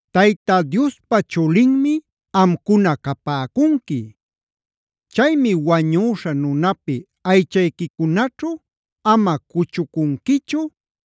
“Tayta Diospa chulinmi amcuna capäcunqui. Chaymi wañüśha nunapi aychayquicunaćhu ama cuchucunquichu,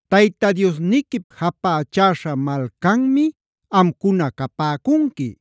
Tayta Diosniquip japächäśha malcanmi amcuna capäcunqui.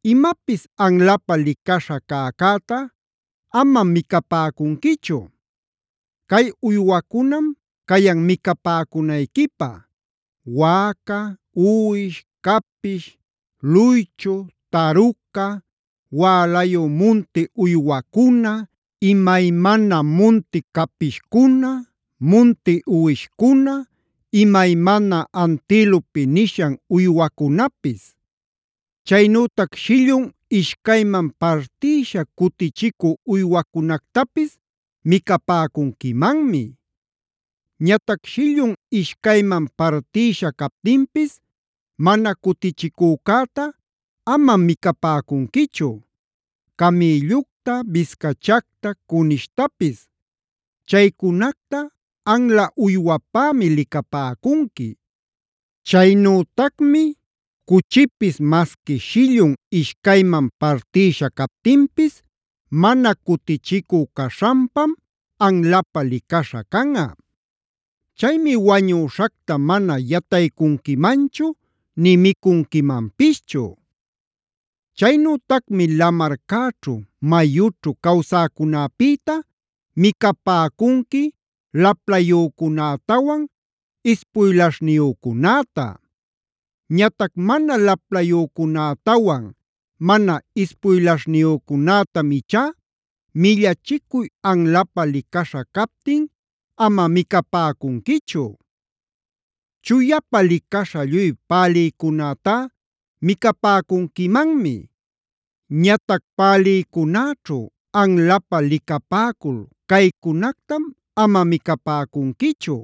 “Imapis anlapä licaśha cäcäta amam micapäcunquichu. “Cay uywacunam cayan micapäcunayquipä: Wäca, uwish, capish, luychu, taruca, wälayu munti uywacuna, imaymana munti capishcuna, munti uwishcuna, imaymana antilope nishan uywacunapis. Chaynütac shillun ishcayman partïsha cutichicü uywacunactapis micapäcunquimanmi. Ñatac shillun ishcayman partïsha captinpis mana cutichicücäta amam micapäcunquichu: camïllucta, biscachacta, cunishtapis. Chaycunacta anla uywapämi licapäcunqui. Chaynütacmi cuchipis masqui shillun ishcayman partïsha captinpis mana cutichicu caśhanpam anlapä licaśha canꞌa. Chaymi wañüśhacta mana yataycunquimanchu ni micunquimanpischu. “Chaynütacmi lamarcäćhu, mayućhu cawsäcunäpïta micapäcunqui laplayücunätawan ispuylaśhniyücunäta. Ñatac mana laplayücunätawan mana ispuylaśhniyücunätamc ichá millachicuy anlapä licaśha captin ama micapäcunquichu. “Chuyapa licaśha lluy pälïcunätá micapäcunquimanmi. Ñatac pälïcunäćhu anlapä licapäcul caycunactam ama micapäcunquichu: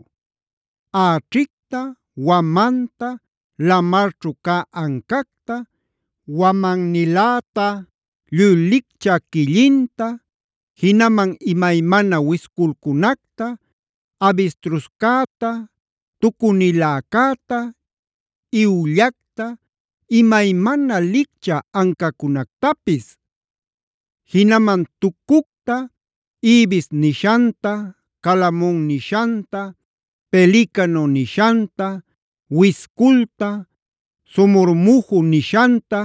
äćhicta, wamanta, lamarćhu cä ancacta, wamanta, lluy lichcä quillinta, jinaman imaymana wisculcunacta, abistruscäta, tucuniläcäta, iwllacta, imaymana licchä ancacunactapis. Jinaman tucucta, ibis nishanta, calamon nishanta, pelicano nishanta, wisculta, somormuju nishanta,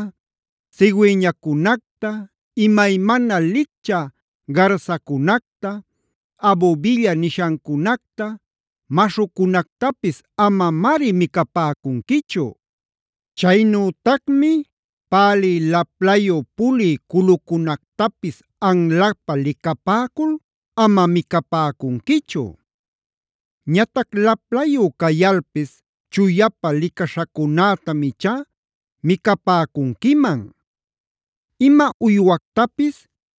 cigüeñacunacta, imaymana licchä garsacunacta, abubilla nishancunacta, maśhucunactapis amamari micapäcunquichu. “Chaynütacmi pälï laplayu pulï culucunactapis anlapä licapäcul ama micapäcunquichu. Ñatac laplayu cayalpis chuyapa licaśhacunätam ichá micapäcunquiman. “Ima uywactapis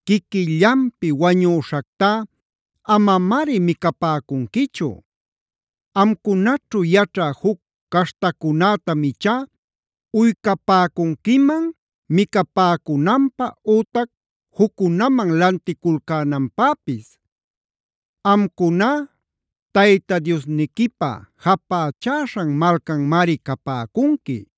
quiquillanpi wañüśhactá amamari micapäcunquichu. Amcunaćhu yaćhä juc caśhtacunätam ichá uycapäcunquiman micapäcunanpä ütac juccunaman lanticulcänanpäpis. Amcuná Tayta Diosniquipä japächäśhan malcanmari capäcunqui.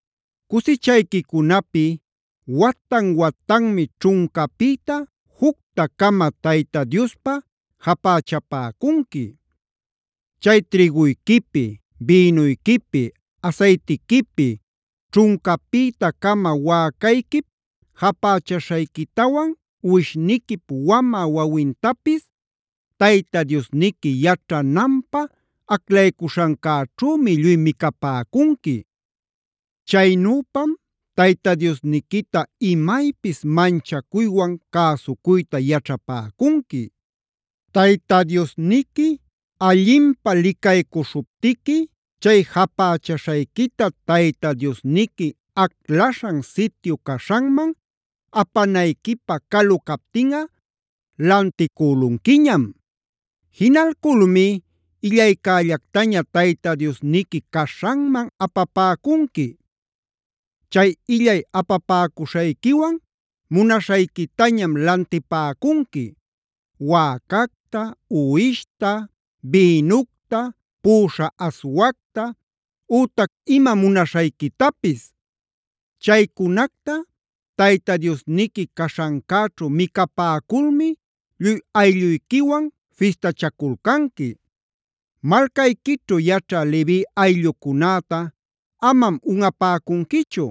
“Cusichayquicunapi watan-watanmi ćhuncapïta jucta-cama Tayta Diospä japächapäcunqui.e Chay trïguyquipi, bïnuyquipi, asaytiquipi, ćhuncapïta-cama wäcayquip japächaśhayquitawan, uwishniquip wamä wawintapis Tayta Diosniqui yaćhananpä aclaycuśhancäćhümi lluy micapäcunqui. Chaynüpam Tayta Diosniquita imaypis manchacuywan cäsucuyta yaćhapäcunqui. Tayta Diosniqui allinpä licaycuśhuptiqui chay japächaśhayquita Tayta Diosniqui aclaśhan sityu caśhanman apanayquipä calu captinꞌa, lanticülunquiñam. Jinalculmi illaycällactaña Tayta Diosniqui caśhanman apapäcunqui. Chay illay apapäcuśhayquiwan munaśhayquitañam lantipäcunqui: wäcacta, uwishta, bïnucta, puꞌuśha aswacta, ütac ima munaśhayquitapis. Chaycunacta Tayta Diosniqui caśhancäćhu micapäculmi lluy aylluyquiwan fistachaculcanqui. “Malcayquićhu yaćhä Levi ayllucunäta amam unꞌapäcunquichu.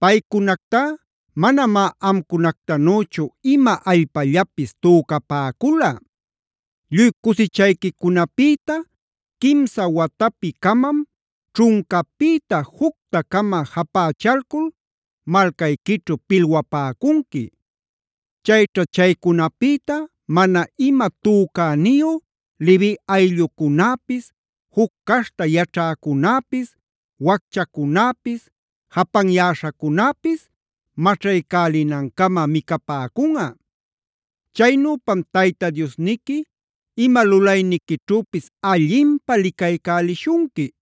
Paycunactá manamá amcunactanüchu ima allpallapis tücapäcula. “Lluy cusichayquicunapïta quimsa watapi-camam ćhuncapïta jucta-cama japächalcul malcayquićhu pilwapäcunqui. Chayćha chaycunapïta mana ima tücaniyu Levi ayllucunäpis, juc caśhta yaćhäcunäpis, wacchacunäpis, japanyäśhacunäpis maćhaycälinancama micapäcunꞌa. Chaynüpam Tayta Diosniqui ima lulayniquićhüpis allinpä licaycälishunqui.